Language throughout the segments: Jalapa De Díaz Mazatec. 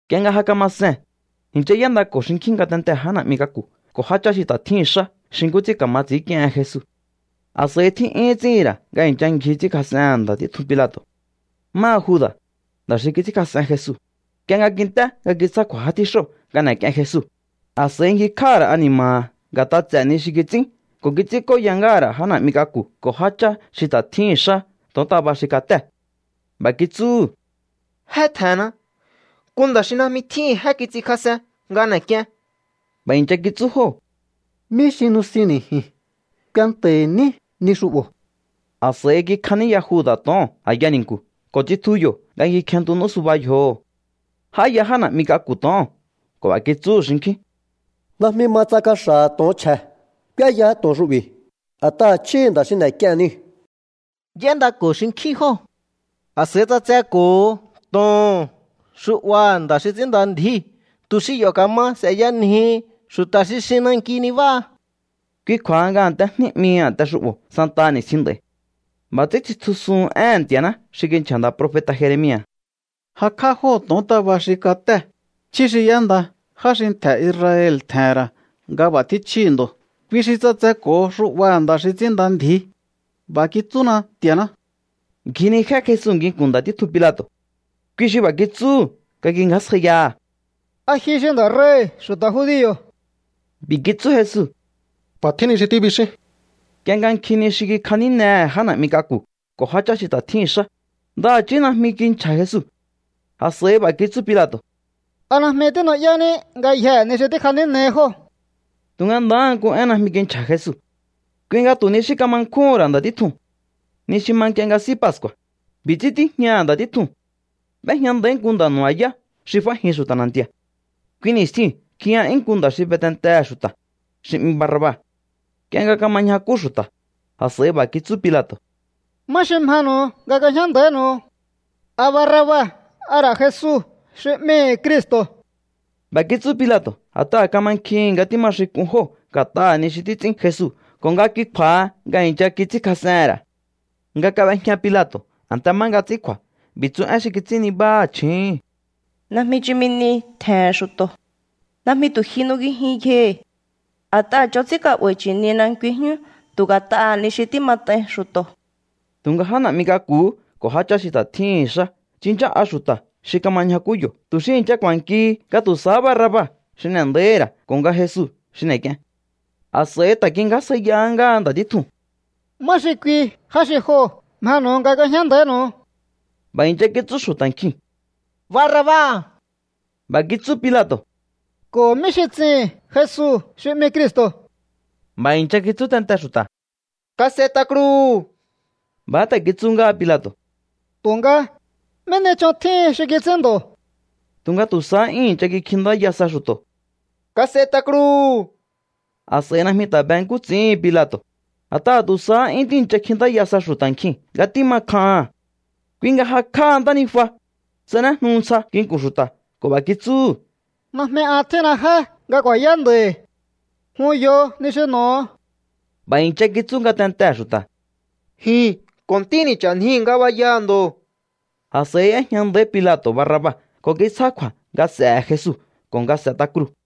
Nk'ie nga ja kama see̱n, i̱ncha y'éndako̱ xinkjín ngatentee̱ já na̱'mi k'aku̱ ko̱ jáchá xi ta̱ tjíhi̱n xá xi nkú ts'ín ka̱ma ts'i̱ínk'iehen Jesu. A̱s'a̱i tjí'yúhún ts'íhi̱n ra̱ nga i̱ncha ngji ts'ínkjas'ehe̱n nda̱ títjun Pilato̱. Máha Juda̱, nda̱ xi kits'ínkjas'en Jesu, nk'ie nga kint'é nga kitsjá kju̱a̱ já tjíxóo̱ nga n'e̱k'ien Jesu, a̱s'a̱i ngjikj'áha̱ ra̱ ani̱ma̱ha̱ nga̱t'a ts'e̱ ni xi kits'ín ko̱ kits'ínk'óya ngáha̱ ra̱ já na̱'mi k'aku̱ ko̱ jáchá xi ta̱ tjíhi̱n xá to̱ontaba xi katée̱. B'a̱ kitsúhu̱: —Jé tje̱nna. Nku nda̱ xi najmi tjíhi̱n jé kits'inkjas'en nga n'e̱k'ien. B'a̱ i̱ncha kitsú jóo̱: —¿Mí xi nusinni̱ ji̱n? Kuenta̱hi̱ ní ni xu'bo̱. A̱s'a̱i kikjaníya Juda̱ to̱oo̱n a̱ya ni̱nku̱ ko̱ tsitju yo̱ nga ngji kjenntu n'ú suba yjoho̱. J'áya já na̱'mi k'aku̱ to̱oo̱n ko̱ b'a̱ kitsúhu̱ xinkjín: —Najmi ma tsa kaxa̱ha̱ to̱on chje̱ k'úéyaá to̱on xu'bi̱, a̱t'aha̱ chjíhi̱ nda̱ xi n'e̱k'ie̱n niu̱. Y'éndako̱ xinkjín jóo̱. A̱s'a̱i ts'atseko̱ho to̱oo̱n xu'baha̱ nda̱ xi ts'ínnda ndji̱í tu̱ xi yo̱ ka̱ma s'e̱yanjihi xu̱ta̱ xi xin nanki nibáha. Kui kju̱a̱ha nga A̱nte Jní 'mihi a̱nte xu'bo̱ santaha ni̱stjin nd'a̱i̱. B'a̱ ts'ín tsitjusuhun éhe̱n Nti̱a̱ná xi kinchja̱ nda̱ profeta̱ Jeremia̱: “Jakj'á jóo̱ to̱ontaba xi katée̱, chjí xi y'énda já xi ntje̱ Israel tje̱he̱n ra̱ nga b'a̱ tjín chjíhi̱ ndo̱. Kui xi ts'atseko̱ho xu'baha̱ nda̱ xi ts'ínnda ndji̱í. B'a̱ kitsúna Nti̱a̱ná.” Ngjinijé Jesu nginku̱n nda̱ títjun Pilato̱. Kui xi b'a̱ kitsúhu̱ nga kingjásjaiyaha̱: —¿A ji xi nda̱ rei̱hi̱ xu̱ta̱ judio̱? B'i̱ kitsú Jesu: —B'a̱ tjín ni xi tíbixín. Nk'ie nga nkjin ni xi kikjanínehe̱ já na̱'mi k'aku̱ ko̱ jáchá xi ta̱ tjíhi̱n xá, ndaha̱chí najmi kinchja̱ Jesu. A̱s'a̱i b'a̱ kitsú Pilato̱: —¿A najmi tínu'yání ngayjee̱ ni xi tíkjanínehi jóo̱? Tu̱nga ndahá nku én najmi kinchja̱ Jesu. Kui nga tu̱ ni xí kama nkjúhu̱n ra̱ nda̱ títjuu̱n. Ni xi ma nk'ie nga S'í Pascu̱a̱, b'i̱ ts'ín tíjñaha̱ nda̱ títjuu̱n. B'éjña nda̱í nku nda̱ nu̱ba̱yá xi f'ájin xu̱ta̱ na̱nti̱a̱. Kui ni̱stjiu̱n kjiya'yún nku nda̱ xi be tentehe̱ xu̱ta̱, xi 'mi Barraba. Nk'ie nga kama ñjakú xu̱ta̱, a̱s'a̱i b'a̱ kitsú Pilato̱: —¿Má xi mjenu̱u nga k'uejñá nda̱ínu̱u? ¿A Barraba a ra̱ Jesu xi 'mihi̱ Cristo̱? B'a̱ kitsú Pilato̱ a̱t'aha̱ kamankjihi̱n nga tíma xin k'un jóo̱ nga̱t'aha̱ ni xi títs'ín Jesu ko̱ nga kui kju̱a̱ha nga i̱ncha kits'ínkjas'ehe̱n ra̱. Nga kab'ejña Pilato̱ a̱nte má nga ts'ín kju̱a̱, b'i̱ tsu én xi kits'ín nibáha̱ chju̱úhu̱n: “Najmi chumi ni tje̱he̱n xu̱to̱. Najmi tu̱ ji nungijin yjohi̱. A̱t'aha̱ ch'on ts'ín ka'ba̱i̱ chi̱nina nkui jyún tu̱ nga̱t'aha̱ ni xi tímat'ain xu̱to̱.” Tu̱nga já na̱'mi k'aku̱hú ko̱ jáchá xi ta̱ tjíhi̱n xá tsinchá'a xu̱ta̱ xi kama ñjakú yo̱ tu̱ xi i̱ncha ku̱a̱nkihi nga tu̱ sahá Barraba xi n'e̱ nda̱íhi̱ ra̱ ko̱ nga Jesu xi n'e̱k'ien. A̱s'a̱i ta̱ kingjásjaiyahá ngáha nda̱ títjuu̱n: —¿Má xi kui já xi joo̱ mjenu̱u nga k'uejñá nda̱ínu̱u? B'a̱ i̱ncha kitsú xu̱ta̱ nkjiu̱n: —Barraba. B'a̱ kitsú Pilato̱: —¿Ko̱ mí xi ts'ihi̱n Jesu xi 'mi Cristo̱? B'a̱ i̱ncha kitsú tente xu̱ta̱: —¡Kas'et'a kruu̱! B'a̱há ta̱ kitsú ngáha Pilato̱: —Tu̱nga, ¿mí ni ch'on tjíhin xi kits'ín ndo̱? Tu̱nga tu̱ sahá 'yún i̱ncha kikjintáya sa xu̱to̱: —¡Kas'et'a kruu̱! A̱s'a̱i najmi ta̱ be nkú ts'i̱íhin Pilato̱, a̱t'aha̱ tu̱ sahá 'yún tíi̱ncha kjintáya sa xu̱ta̱ nkjiu̱n nga tíma kjaha̱n. Kui nga jakj'áha ntánijua, tsanéjnu ntsja nginku̱n xu̱ta̱ ko̱ b'a̱ kitsúhu̱: —Najmi an tjínna jé nga ku̱a̱yá nda̱i̱. Jun yo ni xi n'o̱o. B'a̱ i̱ncha kitsú ngatentee̱ xu̱ta̱: —Ji̱n ko̱ ntíni̱ ch'a̱njii̱ ngabayaha̱ ndo̱. A̱s'a̱i y'éjña nda̱í Pilato̱ Barraba ko̱ kitsjá kju̱a̱ nga s'e̱he̱ Jesu ko̱ nga s'e̱t'a kruu̱.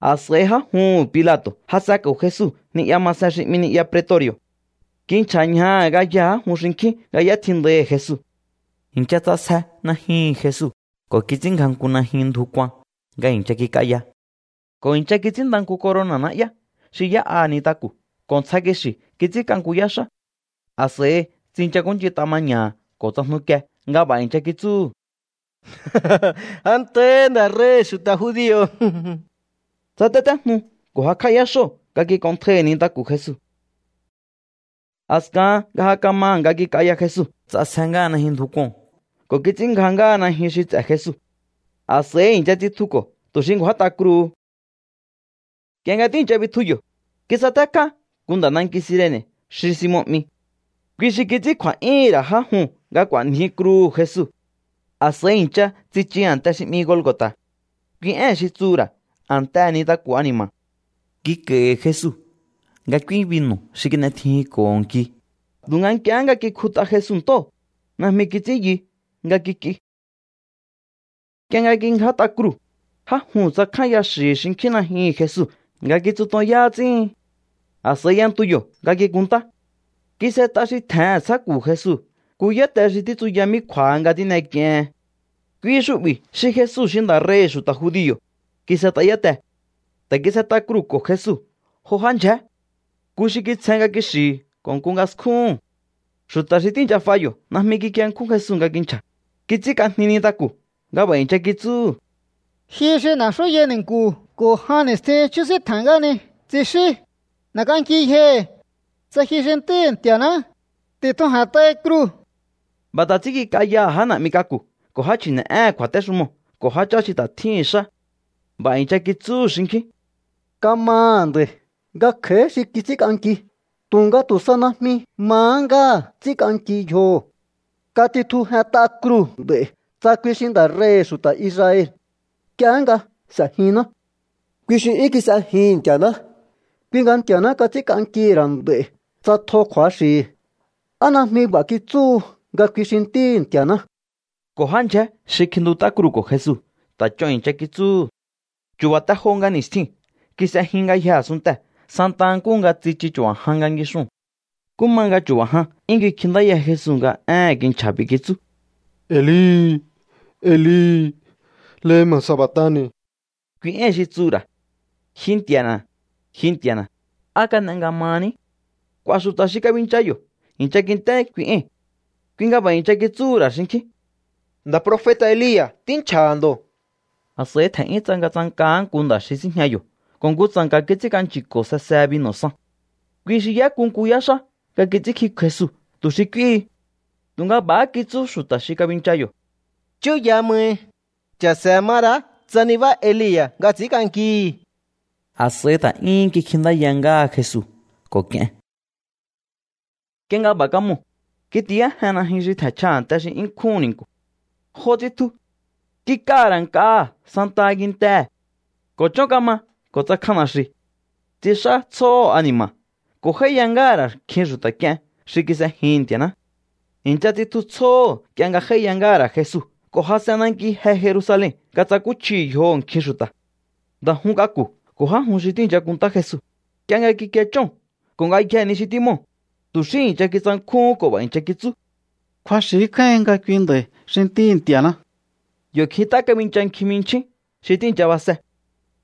A̱s'a̱i já juhu̱n Pilato̱ jas'enko̱ Jesu ni'ya masen xi 'mi ni'ya pretori̱o̱. Kinchja̱ ñjaha̱ ngayjee̱ já jun xinkjín nga y'étjindaihi̱ Jesu. I̱ncha ts'asje najyuhu̱n Jesu ko̱ kits'ínngja nku najyun ndju kuan nga i̱ncha kik'aya. Ko̱ i̱ncha kits'ínnda nku corona̱ na'yá xi y'é'a nintaku̱ ko̱ ntsja kixi̱ kits'ínk'a nku yáxá. A̱s'a̱i tsinchakúnch'int'a maña̱ha̱ ko̱ tsajnukie nga b'a̱ i̱ncha kitsúhu̱: —Antahi, nda̱ rei̱hi̱ xu̱ta̱ judio̱. Tsatétéjnu ko̱ jakj'á yáxóo̱ nga kik'onntjai nintaku̱ Jesu. A̱skahan nga ja kamaha̱ nga kik'aya Jesu, ts'asje ngáha najyun ndju kuo̱n ko̱ kits'ínngja ngáha najyun xi ts'e̱ Jesu. A̱s'a̱i i̱ncha tsitjuko̱ tu̱ xi ngju̱át'a kruu̱hu. Nk'ie nga tíi̱ncha bitju yo̱, kisatékjá nku nda̱ nanki Cirene̱ xi Simon 'mi. Kui xi kits'ín kju̱a̱'yúhu̱n ra̱ já juu̱n nga k'u̱a̱nji kruu̱hu̱ Jesu. A̱s'a̱i i̱ncha tsichu a̱nte xi 'mi Golgo̱ta̱. Kui ée̱n xi tsuhu̱ ra̱: A̱ntehe̱ Nintaku̱ Ani̱ma̱. Kik'a̱i̱hi̱ Jesu nga k'úí binu̱ xi kin'etjijinko̱ho nki, tu̱nga nk'iehé nga kikjut'a Jesu ntóo̱, najmi kits'ín yu nga kik'i. Nk'ie nga kingját'a kruu̱, já juu̱n tsakjánya xi̱hi̱ xinkjín najyuhu̱n Jesu nga kitsutonyá ts'íhin. A̱s'a̱i y'entu yo̱ nga kikunntá. Kis'et'a xi tje̱hen a̱ntsjáku̱ Jesu nku yáte xi títsuya mí kju̱a̱ha nga tín'ek'iehen. “Kui xu'bi̱ xi Jesu xi nda̱ rei̱hi̱ xu̱ta̱ judio̱”, kis'et'a yátee̱. Ta̱ kis'et'a kruu̱ko̱ Jesu jo já ndyjé. Nku xi kitsjen nga kixi̱hi̱ ko̱ nku nga skjúhu̱n. Xu̱ta̱ xi tíi̱ncha f'a yo̱ najmi kikienkjún Jesu nga kinchja̱. Kits'ínk'ajni nintaku̱ nga b'a̱ i̱ncha kitsúhu̱: —Ji xi n'e̱xúyai ni̱nku̱ ko̱ jan ni̱stjin chjúsíntje̱n ngáhani, tsixín, n'e̱k'anki yjohi̱. Tsa ji xi Ntíhi̱ Nti̱a̱ná, ti̱tjuje̱nt'ai kruu̱. B'a̱ ta̱ ts'ín kik'ayaha̱ já na̱'mi k'aku̱ ko̱ já chji̱ne̱'éhe̱n kju̱a̱téxumoo̱ ko̱ jáchá xi ta̱ tjíhi̱n xá. B'a̱ i̱ncha kitsúhu̱ xinkjín: —Kamaha̱ nda̱i̱ nga kj'a̱í xi kits'ínk'anki, tu̱nga tu̱ sa najmi mahá ngáha̱ ts'ínk'anki yjoho̱. Katitjujent'a kruu̱ nd'a̱i̱ tsa kui xi nda̱ rei̱hi̱ xu̱ta̱ Israel. Nk'iehé nga s'e̱jinná. Kui xi 'yún kis'ejihi̱n Nti̱a̱ná, kui nga Nti̱a̱ná kats'ínk'ankihi̱ ra̱ nd'a̱i̱ tsa tjo kju̱axi̱hi̱. ¿A najmi b'a̱há kitsú nga kui xi Ntíhi̱ Nti̱a̱ná? Ko̱ já ndyjé xi kjintut'á kruu̱ko̱ Jesu ta̱ ch'on i̱ncha kitsúhu̱. Chu̱ba̱ te jo nga ni̱stjiu̱n kis'e jyun ngayjee̱ a̱sunntee̱ santa nkúhu nga tsichu chu̱ba̱ jan nga ngixuu̱n. Nkú ma nga chu̱ba̱ jan 'yún kikjintáya Jesu nga éhe̱n kinchja̱. B'i̱ kitsú: —Eli, Eli, ¿lema sabactani̱? —kui éi̱n xi tsuhu̱ ra̱: Ji Nti̱a̱na̱, ji Nti̱a̱na̱, ¿á kan'e nga mahaní? K'u̱a̱ xu̱ta̱ xi kabincha yo̱ i̱ncha kint'é kui ée̱n. Kui nga b'a̱ i̱ncha kitsúhu̱ ra̱ xinkjín: —Nda̱ profeta̱ Elia̱ tínchja̱ha̱ ndo̱. A̱s'a̱i tje̱n'yún tsangatsankahá nku nda̱ xi síjña yo̱ ko̱ nku tsa̱nka̱ kits'ínk'anchi̱ko̱ sesehe binu̱ san. Kui xi y'éku nku yáxá nga kits'ínkjik'uhu̱n Jesu tu̱ xi k'úíhi. Tu̱nga b'a̱há kitsú xu̱ta̱ xi kabincha yo̱: —Chúya mai. Cha̱se̱ ma ra̱á tsa nibá Elia̱ nga ts'i̱ínk'ankihi̱. A̱s'a̱i ta̱ 'yúhún kikjintáya ngáha Jesu ko̱ k'ien. Nk'ie nga b'a̱ kamoo̱, kitiyájen najyun xi tje̱nchja a̱nte xi 'yún nkjúhu̱n ni̱nku̱. Jo tsitju. Kik'aha̱ ra̱ nk'aha̱ santaha kintee̱. Ko̱ chón kama ko̱ tsakjan na̱xi̱u̱. Tsix'á tsjóho̱ ani̱ma̱ ko̱ j'áíya ngáha̱ ra̱ nkjin xu̱ta̱ k'ien xi kis'ejihi̱n Nti̱a̱ná. I̱ncha tsitju tsjóho̱ nk'ie nga j'áíya ngáha̱ ra̱ Jesu ko̱ jas'en nanki je Jerusalen nga tsakúchjihi̱ yjoho̱ nkjin xu̱ta̱. Nda̱ jun k'aku̱ ko̱ já jun xi tíi̱ncha kunntá Jesu, nk'ie nga kikie chóo̱n ko̱ ngayjee̱ ni xi tímoo̱, tu̱ xí i̱ncha kitsankjúhún ko̱ b'a̱ i̱ncha kitsú: —Kju̱axi̱ kjáíhin nga kui nda̱i̱ xi Ntíhi̱ Nti̱a̱ná. Yo̱ kjint'á kabincha nkjin jminchjín xi tíi̱ncha base.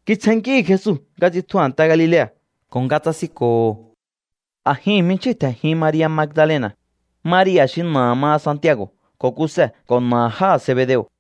Kitsjennkíhi̱ Jesu nga tsitju a̱nte Galilea̱ ko̱ tsasinko̱ho̱. A̱jihi̱n jminchjíu̱n tje̱njin Maria̱ Magdalena̱, Maria̱ xi na̱aha̱ maha Santiago̱ ko̱ Kuse, ko̱ na̱aha̱ jáha̱ Zebedeo̱.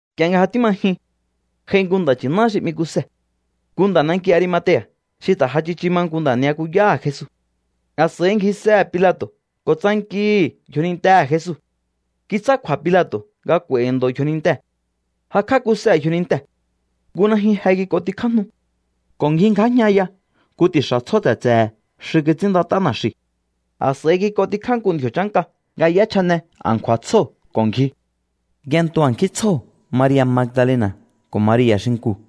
Nk'ie nga ja tíma jyun, j'ai nku nda̱ nchi̱ná xi 'mi Kuse, nku nda̱ nanki Arimatea̱ xi ta̱ ja tsichu ma nku nda̱ ni'yakuyáha̱ Jesu. A̱s'a̱i ngjisehe̱ Pilato̱ ko̱ tsankihi̱ yjonintehe̱ Jesu. Kitsjá kju̱a̱ Pilato̱ nga k'u̱a̱i̱hi̱ ndo̱ yjonintee̱. Jakj'á Kuse yjonintee̱. Nku najyun je kik'ontikjájnu ko̱ ngjingjájñaya nku ti̱xa̱ tsjó tse̱tse̱he̱ xi kits'ínndat'á na̱xi̱u̱. A̱s'a̱i kik'ontikjá nku ndji̱o̱ chánka nga y'échjane a̱nkju̱a̱ tsjóo̱ ko̱ ngji. Y'entu a̱nkjín tsjóo̱ Maria̱ Magdalena̱ ko̱ Maria̱ xinkuu̱.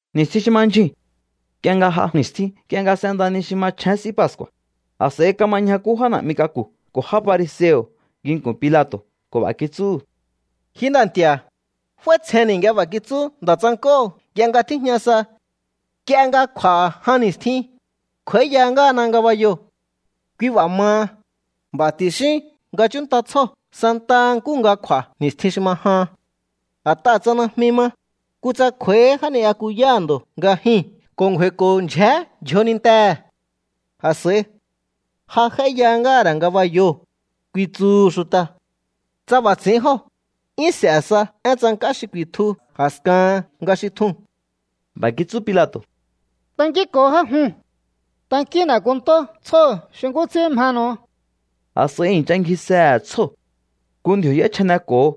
Ni̱stjin xi ma ndyjuu̱n, nk'ie nga j'a ni̱stjin nk'ie nga s'enda ni xi machjén S'í Pascu̱a̱, a̱s'a̱i kama ñjakú já na̱'mi k'aku̱ ko̱ já fariseo̱ nginku̱n Pilato̱ ko̱ b'a̱ kitsúhu̱: —Ji nda̱ nti̱a̱, f'áítsjenni̱ nga b'a̱ kitsú nda̱ tsank'óo̱ nk'ie nga tíjña sa: “Nk'ie nga kj'u̱a̱ jan ni̱stjin, kj'u̱a̱íya ngáhana ngabayoo̱.” Kui b'a̱ maha, b'a̱ ti̱xín nga chúnnta tsjóo̱ santaha nkúhu nga kj'u̱a̱ ni̱stjin xi ma jahan. A̱t'aha̱ tsa najmi ma, kutsa kj'u̱a̱íhí já ni'yakuyáha̱ ndo̱ nga jyuu̱n ko̱ ngju̱a̱i̱ko̱ ndyjé yjonintehe̱. A̱s'a̱i: “Ja j'áíya ngáha̱ ra̱ ngabayoo̱”, ku̱i̱tsu̱hu̱ xu̱ta̱. Tsa b'a̱ ts'i̱ín jóo̱, 'yún s'e̱ sa én tsank'á xi ku̱i̱tju a̱skahan nga xi tjuu̱n. B'a̱ kitsú Pilato̱: —Tankínko̱o já juu̱n. Tankíún n'e̱ kunntó tsjóo̱ xi nkú ts'ín mjenu̱u. A̱s'a̱i i̱ncha ngjisehe̱ tsjóo̱. Nku ndji̱o̱ y'échjaneko̱ho.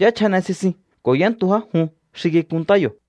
Y'échjane sisin ko̱ y'éntu já jun xi kikunntá yo̱.